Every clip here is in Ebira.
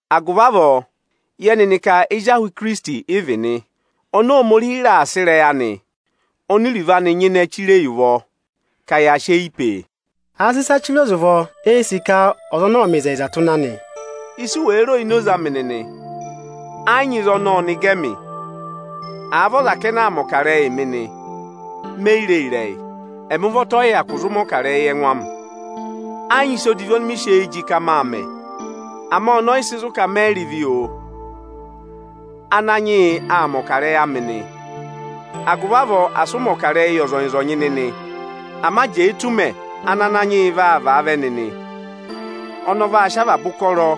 Agụvị avọọ, yẹ nịnị ka ezi ahụ Ikirisiti ị vị nị, oni Ohomorihi raà sị ịrẹyị anị oni iruvo anị nyịnẹ chire yi ụvọ ka ya sị eyi pee. Àa sị ịsa chire ọza ụvọ, eē sì ka ọza ọnọọ ọ̀ọ mẹ ịzẹyịzaa tụ́ ịnị anị. Isu wèe ro ini oze amị nịnị, ẹ yị nyị ịzị ọnọọ ọnị gẹ ẹmị. Àa vị ọza kẹnẹ aa mẹ̀ ọkarẹyị mị nị, me yi ree ịrẹyị. Ẹmị ụvọta ọyị hyakụ zụ mẹ̀ ọkarẹyị yị ẹngụ amị. Ẹ yị nyị ịsa odivi ọnị mị sị eyi jị ka máa mẹ, ama ọnọọ ọyị sị zụ̀ ka mẹyị rị ịvị, oo. Ananyị yị aa mẹ̀ ọkarẹyị amị nị. Agụvị avọọ, asị ụ mẹ̀ ọkarẹyị yị ọzọnyị-ọzọnyị nịnị, ama jẹẹ tù ụmẹ ana Ananyị yị vaa vaa vẹ nịnị! Ọnị ọ vaa sị avaba ụkọrọ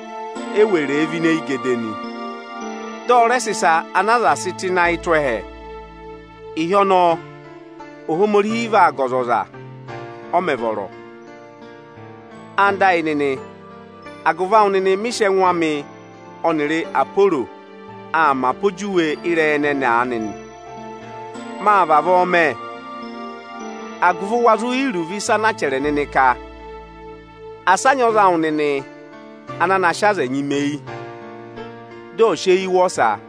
eweree vẹ ini eyigede nị, dị ọ rẹ sị ịsa ana aza sị tụ́ ịnị ayị tụ́ ẹhẹ. Ịhị ọnọọ, Ohomorihi vaa ga ọzọza, ọ mẹ̀ vọrọ. Ẹwụ nịnị ẹyịnyara amị, agụvị awụ nịnị mị sị ẹngụ amị ọnịrị Aporo aa mẹ apojuwe ịrẹyị ẹnẹnị aanị nị. Máa vavọọ mẹ, agụvị wa zụ yẹ iruvo ịsa anaa chẹrẹ nịnị ka, “Asị a nyị ọza awụ nịnị ana na sị aza ẹnyị mẹ eyi, dị ọ̀ọ sị eyii wụ ọsa!”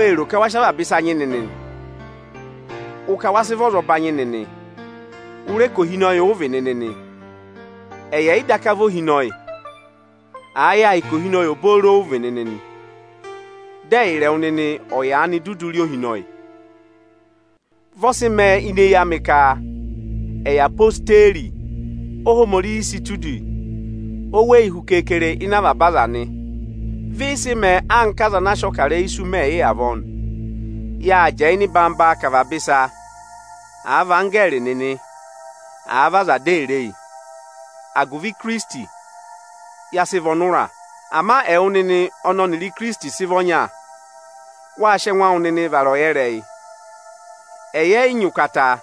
Wée ro ka wa sị avaba ịsa nyị nịnị! Ụ ka wa sị vị ọzọbanyị nịnị, ụ rẹ ka ohinọyị ụ vị nịnị nị, ẹyị ẹ̀yị daka vị ohinọyị. Àa yẹ à hị́ ka ohinọyị obooro ụ vị nịnị nị, dị ẹyịrị ẹwụ nịnị ọ̀ yaanị dudu rị ohinọyị! Vị ọ sị mẹẹ ini eyi amị ka ẹyị odeyi, Óhomorihi sị tụ́ udi oweyi hu keekere ịnị avaba aza nị. Vị ị sị mẹẹ anka aza ana a sị ọkarẹyị isu mẹ yị avọọ nị. Yáa jẹẹ ịnị ịnọyị-ịnọyị ka avaba ịsa, àa vị anggẹẹrị nịnị, àa vị aza dị èe re yi. Agụvị Ikirisiti, ya sị vị ọnụra. Ama ẹwụ nịnị ọnị ọnịrị Ikirisiti sị vị ọnya, wáa sị ẹngụ awụ nịnị vara ọyẹrẹyị. Ẹyị ẹ yị nyị ụkata,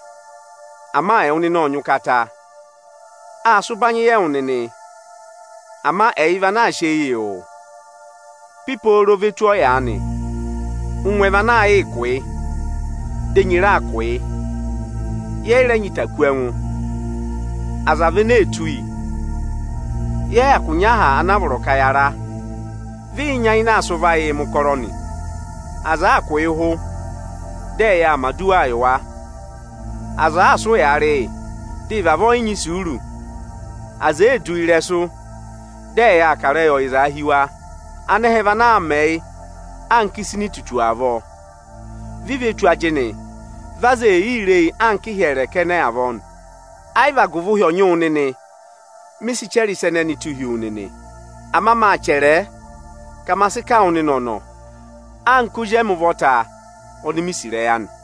ama ẹwụ nịnị ọ́ọ nyị ụkata. Áa sị ụbanyị yị ẹwụ nịnị, ama ẹyị vị ana aa sị eyii wụ. Pipooro ve tù ọyaanị, ụngwẹ vị ana aa yịị kụ́ yị, dị enyi raa kụ̀ yị. Yẹ yị rẹ nyị ịta kú ẹngụ, aza vị ene ee tụ́ yi. Yẹ yị hyakụ nyị aha ana a vọrọ ka ya ra. Vị ị nyayịnẹ aa sị ụvọ ayịị mẹ̀ ụkọrọ nị. Aza àaa kụ̀ yị ụhụ, dị ẹyị aa mẹ̀ aduwaa yị wa. Aza àaa sị ụyaa rị yị, dị ị vavọọ yị nyị isuuru. Aza èee du yi ịrẹsụ, dị ẹyị aa kà ịrẹyị ọyịzaa hi wa. Anẹhẹ vị ana aa mẹ yị anka ịsa ini itutu avọọ. Vi ve tù ajịnị, vị aza ee yii re yi anka ịhyẹrẹ kẹnẹ avọọ nị. Ayị vị agụvị ụhị ọ̀ nyị wụ nịnị, mị sị chẹrẹ ịsa ẹnẹnị tụ́ hi wu nịnị. Ama máa chẹrẹẹ ka ma sị kà wụ nịnị ọ̀nọ̀ anka ozi emi ụvọta oni mi sì ịrẹyị anị.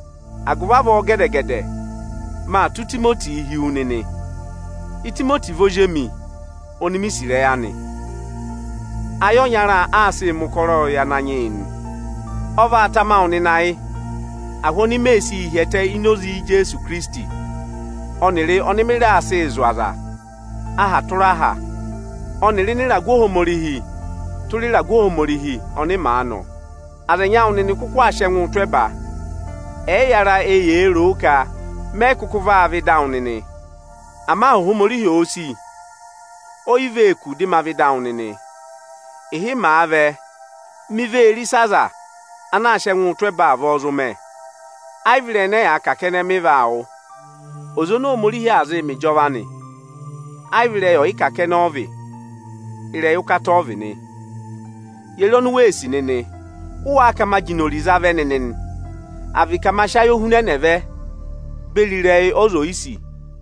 Agụvị avọọ, gẹdẹ-gẹdẹ, maa tụ́ Itimotii hi wu nịnị. Itimoti vị ozi emi oni mi sì ịrẹyị anị. Ayị ọnya aa sịị mẹ̀ ụkọrọ yị Ananyị yị nị. Ọ vaa tama wụ nịnị ayị ahụ oni mee sii hi ẹtẹ ini oze Ijeesu Ikirisiti ọnịrị ọnị mị raa sịị zụ̀ aza aha tụra aha ọnịrị ịnị ịragụ Ohomorihi tụra ịragụ Ohomorihi ọnị màa nọ. Aza ẹnyị awụ nịnị kụkụ aa sị ẹngụụ tụ́ ẹba, ẹyịyara eyee roo ka mẹyị kụkụ vaa vẹ ịda awụ nịnị. Ama Ohomorihi òo sì, oyi vee kù dị ma vẹ ịda awụ nịnị. Ịhị màa vẹ, mi vee re ịsị aza ana aa sị ẹngụụ tụ́ ẹba avọọ zụ mẹ, ayị vị ịrẹyị ẹnẹ ẹyaa kà kẹnẹ mị vaa wụ́. Oze oni Ohomorihi aa zịị mẹ ịjọva anị, ayị vị ịrẹyị ọyịkà kẹnẹ ọ vị, ịrẹyị ụkata ọ vị nị. Ye re oni u sì nịnị? Ụ waa ka ma jị inori za vẹ nịnị nị? À vị ka ma sị ayohunẹnẹ vẹ beri ịrẹyị ọza oyisì?